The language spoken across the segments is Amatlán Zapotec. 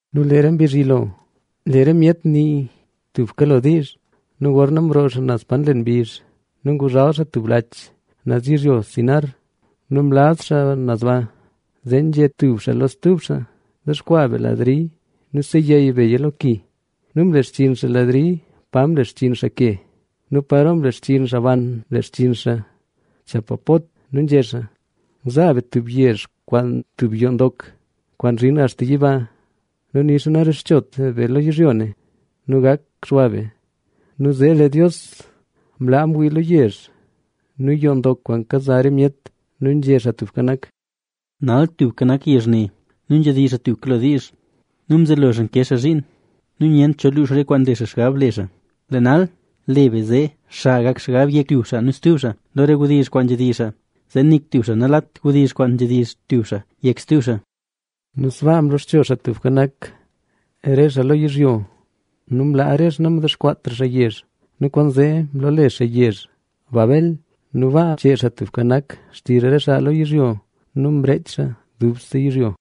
Nu lee re mbizh yilo, lee re myet nii tuka lo diizh. Nu gorna mroo xaa naz pa nlen mbizh nu nguzhal xaa tub laach naz yizhyo Sinar nu mlaz xaa naz ba. Zee nzhé tub xaa lo stub xaa: —Dexkwaa be ladri nu seyey beya lo ki. Nu mlexchinn xaa ladri pa mlexchinn xaa ke. Nu paro mlexchinn xaa ban, mlexchinn kwaan nzhak kwenta chapapot. Nu nzhé xaa: —Zaa be tub yezh kwaan tub yoo ndok, kwaan zhin axta yiba. Nu nixa narexchot be lo yizhyo nu gak xwa be. Nu zee lee Dios mla mwii lo yezh nu yoo ndok kwaan kaza re myet. Nu nzhé Xaa Tubka Nak: —Nal tubka nak yezh ne nu nzhedizh xaa tuka lo diizh nu mzelo xaa ke xaa zhiin nu nyent cho luux re kwaan nle xaa xgab le xaa. Lee nal, le be zee xa gak xgab yek tub xaa nu stub xaa lo re wdizh kwaan nzhedizh xaa, zee nik tub xaa nalat wdizh kwaan nzhedizh tub xaa yek stub xaa. Nu sbaa mloxcho Xaa Tubka Nak re xaa lo yizhyo; nu mlaa re xaa namdexkwaatra xaa yezh. Nu kwaanzee mloole xaa yezh Babel nu baa mchee Xaa Tubka Nak xtizh re xaa lo yizhyo nu mreech xaa dubse yizhyo.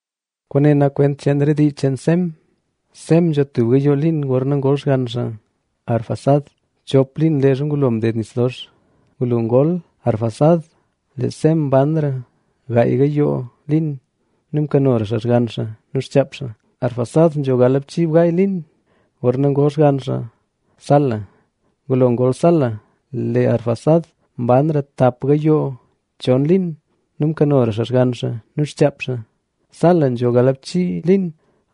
Kwaane nak kwent cheen re dii cheen Sem. Sem nzho tub gayoo liin gorna ngol xgann xaa Arfaxad, chop liin leezha ngulo mded nis dox. Ngulo ngol Arfaxad, lee Sem mbanra gaay gayoo liin nu mkanora xaa xgann xaa nu xchaap xaa. Arfaxad nzho galbchiibgaay liin gorna ngol xgann xaa Sala. Ngulo ngol Sala, lee Arfaxad mbanra tap gayoo chon liin nu mkanora xaa xgann xaa nu xchaap xaa. Sala nzho galbchii liin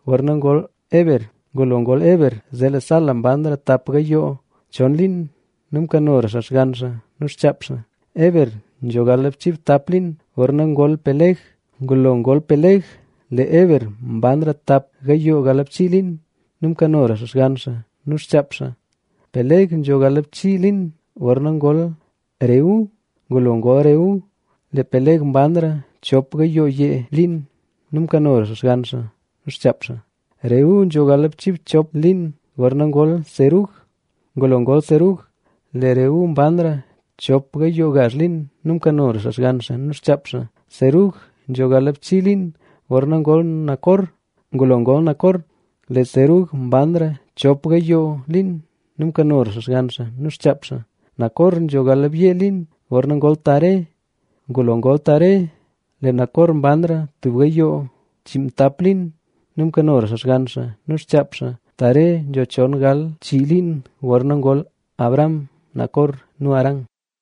gorna ngol Heber. Ngulo ngol Heber, lee Sala mbanra tap gayoo chon liin nu mkanora xaa xgann xaa nu xchaap xaa. Heber nzho galbchiibtap liin gorna ngol Peleg. Ngulo ngol Peleg, lee Heber mbanra tap gayoo galbchii liin nu mkanora xaa xgann xaa nu xchaap xaa. Peleg nzho galbchii liin gorna ngol Reu. Ngulo ngol Reu, lee Peleg mbanra chop gayoo yee liin nu mkanora xaa xgann xaa nu xchaap xaa. Reu nzho galbchiibchop liin gorna ngol Serug. Ngulo ngol Serug, lee Reu mbanra chop gayoo gazh liin nu mkanora xaa xgann xaa nu xchaap xaa. Serug nzho galbchii liin gorna ngol Nacor. Ngulo ngol Nacor, lee Serug mbanra chop gayoo liin nu mkanora xaa xgann xaa nu xchaap xaa. Nacor nzho galbyee liin gorna ngol Taré. Ngulo ngol Taré, lee Nacor mbanra tub gayoo chiinmtap liin nu mkanora xaa xgann xaa nu xchaap xaa. Taré nzho chon gal chii liin gorna ngol Abram, Nacor nu Harán.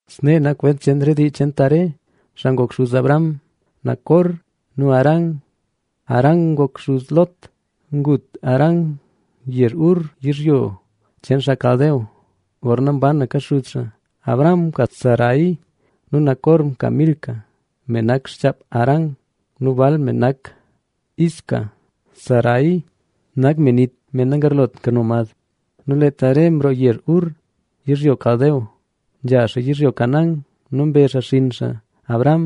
Snee nak kwent cheen re dii cheen Taré, xaa ngok xuz Abram, Nacor nu Harán. Harán ngok xuz Lot. Ngut Harán yezh Ur yizhyo cheen xaa Caldea, gorna mbanka xuz xaa. Abram mka Sarai.a Nu Nacor mka Milca, me nak xchaap Harán nu bal me nak Isca. Sarai nak me nit, me nagarlot kano mad. Nu lee Taré mroo yezh Ur, yizhyo Caldea, nzha xaa yizhyo Canaán. Nu mbe xaa xinn xaa Abram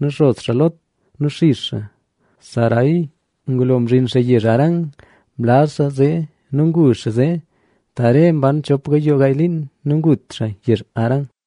nu xos xaa Lot nu xix xaa Sarai. Ngulo mzhin xaa yezh Harán mlaz xaa zee nu ngu xaa zee. Taré mban chop gayoo gaay liin. Nu ngut xaa yezh Harán.